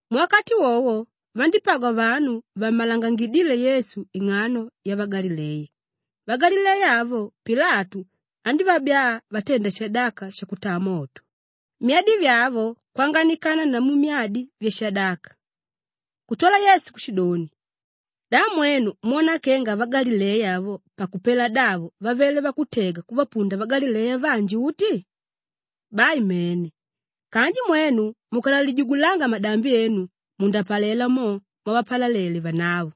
Muwakati wowo, vandípagwa vanu vammalangangidíle Yesu ing'ano yavagalileya; vagalileya avo Pilatu andívabyaa vatenda shadaka shakutaa moto, myadi vyavo kwanganikana namu myadi vyavanyama vashadaka. Kutwala Yesu kushidoni, “Da mwenu mwona kenga vagalileya avo pakupela davo vavele vakutega kuvapunda vagalileya vanji uti? Bai mene! Kanji mwenu mukanalijugulanga madambi enu mundapalela mo mwavapalalele vanavo.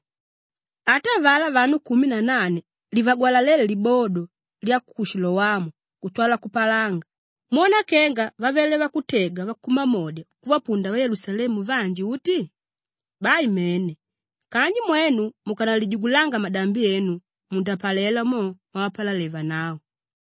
Ata avalá vanu kumi na nane livagwalaléle libodo lya ku Shilowamu kutwala kupalanga, mwona kenga vavele vakutega vakumamodya kuvapunda vayelusalemu vanji uti? Bai mene! Kanji mwenu mukanalijugulanga madambi enu mundapalela mo mwavapalalele vanavo.”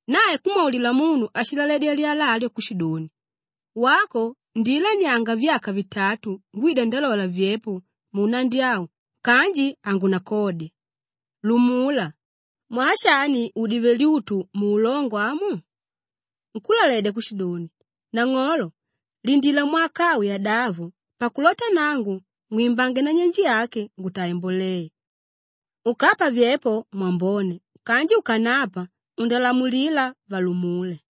Nae kumwaulila munu áshilaledya lyala alyo kushidoni, ‘Wako, ndiilanianga vyaka vitatu ngwida ndalola vyepo munnandi au kanji hangunakodya. Lumula. Mwaa shani udive lyutu muulongo amu?’ Nkúlaledya kushidoni, ‘Nang'olo lindila mwaka au yadavo pakulota nangu ngwimbange nanyenje yake ngutaange mboleya. Ukapa vyepo, mwambone kanji ukanapa, undalamulila valumule.’”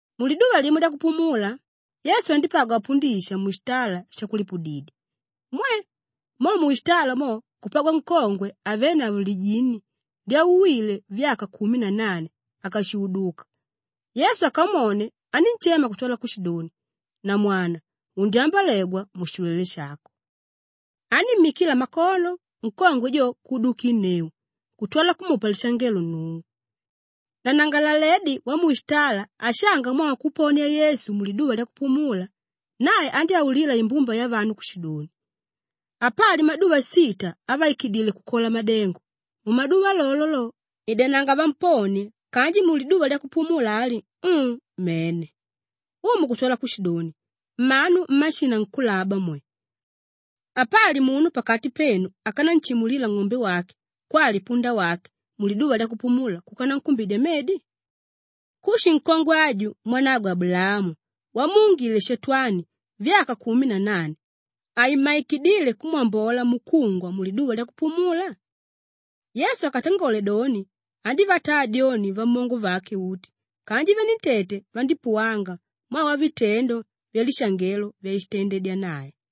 Muliduva limo lyakupumula, Yesu andípagwa apundisha mushitala shakulipudidya. Mwe! Mo mushitala mo kupagwa nkongwe avénavo lijini lyauwíle vyaka kumi na nane ákashuuduka. Yesu akamwone anínshema kutwala kushidoni, “Namwana, undyambolegwa mushilwele shako!” Anímmikila makono, nkongwe jo kuudukinneu kutwala kumupa lishangelo Nnungu. Nanangalaledi wamushitala ashanga mwaa wakuponia Yesu muliduva lyakupumula, nae andyáulila imbumba yavanu kushidoni, “Apali maduva sita avaikidíle kukola madengo; mumaduva lolo lo, idananga vamponie kanji muliduva lyakupumula ali, um, mene.” Umu kutwala kushidoni, “Mmanu mmashinankulaba mwe! Apali munu pakati penu ákananshimulila ng'ombe wake kwali punda wake muliduva lyakupumula kuka nankumbidya medi? Kushi nkongwe aju mwanagwe Abulaamu wamuungile Shatwani vyaka kumi na nane, haimmaikidile kumwambola mukungwa muliduva lyakupumula?” Yesu akatangole doni, andívataa dyoni vamongo vake uti kanji venentete vandípuwanga mwaa wavitendo vyalishangelo vyashitandedya nae.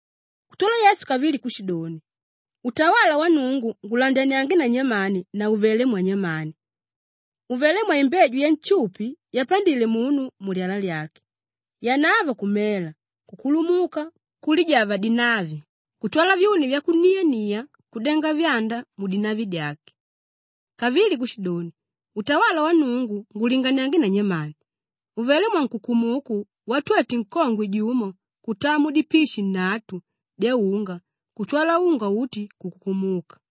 Kutwala Yesu kavili kushidoni, “Utawala wa Nnungu ngulandaniange na nyamani na uvelé mwanyamani? Uvelé mwaimbeju yanshupi yapandile munu mulyala lyake; yanavo kumela, kukulumuka, kulijava dinavi kutwala vyuni vyakuniania kudenga vyanda mudinavi dyake.” Kavili kushidoni, “Utawala wa Nnungu ngulinganiange na nyamani? Uvelé mwankukumuku watwete nkongwe jumo kutaa mudipishi nnatu dyaunga kutwala unga uti kukukumuka.”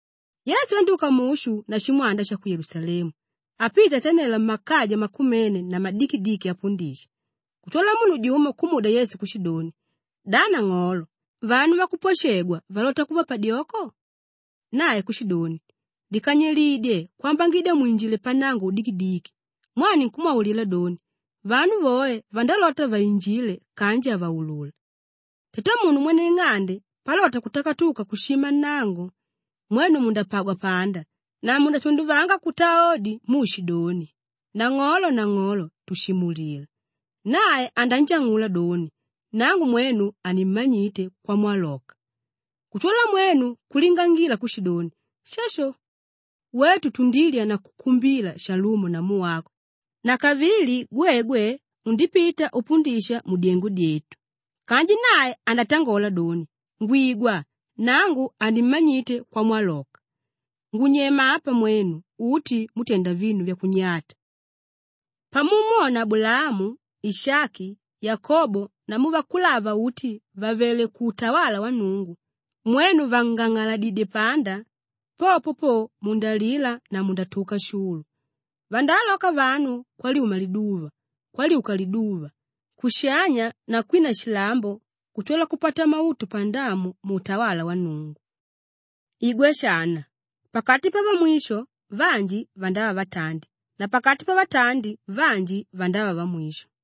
Yesu andyúka mushu na shimwanda sha ku Yelusalemu apita atanela mmakaja makumene na madikidiki apundisha. Kutwala munu jumo kumudya Yesu kushidoni, “Da nang'olo, vanu vakupwashegwa valota kuva padyoko?” Nae kushidoni, “Likanyilidye kwambangidya mwinjilile pannango udikidiki mwaa ninkumwaulila doni, vanu voe vandalota vainjile kanji havaulula. Tatamunu mwene ing'ande palota kutakatuka kushima nnango, mwenu mundapagwa panda na mundatunduvanga kutaa odi muushidoni, ‘Nang'olo, nang'olo, tushimulila!’ Nae ananjang'ula doni, ‘Nangu mwenu hanimmanyite kwamwaloka.’ Kutwala mwenu kulingangila kushidoni, ‘Shasho! Wetu tundilya na kukumbila shalumo namu wako na kavili gwegwe undipita upundisha mudyengo dyetu.’ Kanji nae andatangola doni, ‘Ngwigwa, nangu hanimmanyite kwamwaloka! Ngunyema apa mwenu uti mútenda vinu vyakunyata.’ Pamumwona Abulaamu, Ishaki, Yakobo namu vakulava uti vàvele kuutawala wa Nnungu, mwenu vàngang'aladidye panda, popo po mundalila na mundatuka shulu. Vandaaloka vanu kwalyuma liduva, kwalyuka liduva, kushanya na kwina shilambo kutwala kupata mautu pandamu muutawala wa Nnungu. Igwa shana, pakati pavamwisho vanji vandava vatandi na pakati pavatandi vanji vandava vamwisho.”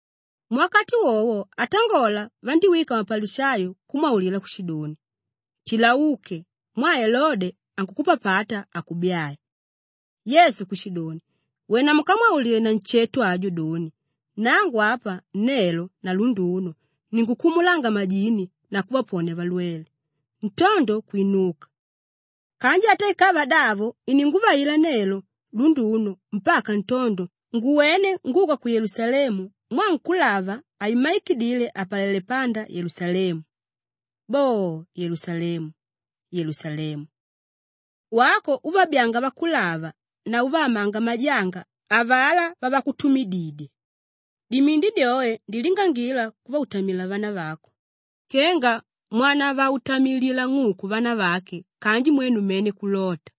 Muwakati wowo atangola vandíwika mapalishayo kumwaulila kushidoni, “Tila uke! Mwaa Elode ankukupapata akubyae.” Yesu kushidoni, “Wena mukamwaulile nansheto ajo doni, ‘Nangu apa, nelo na lunduno ninkukumulanga majini na kuvaponia valwele; ntondo kwinuka. Kanji ata ikava davo ininguvaikila nelo, lunduno mpaka ntondo nguwene nguka ku Yelusalemu mwaa nkúlava haimmaikidile apalele panda Yelusalemu.’ Boo, Yelusalemu! Yelusalemu! Wako úvabyaanga vakulava na úvaamanga majanga avalá vavakutumididya! Dimindi dyoe ndilingangila kuvautamila vanavako kenga mwanavautamililila ng'uku vanavake kanji mwenu mene kulota.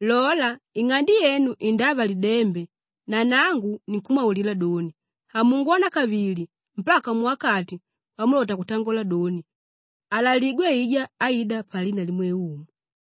Lola, ing'ande yenu indava lidembe na nangu ninkumwaulila doni, hamungwona kavili mpaka muwakati wamulota kutangola doni, ‘Aalaligwe aijá áida palina limwe Umu.’”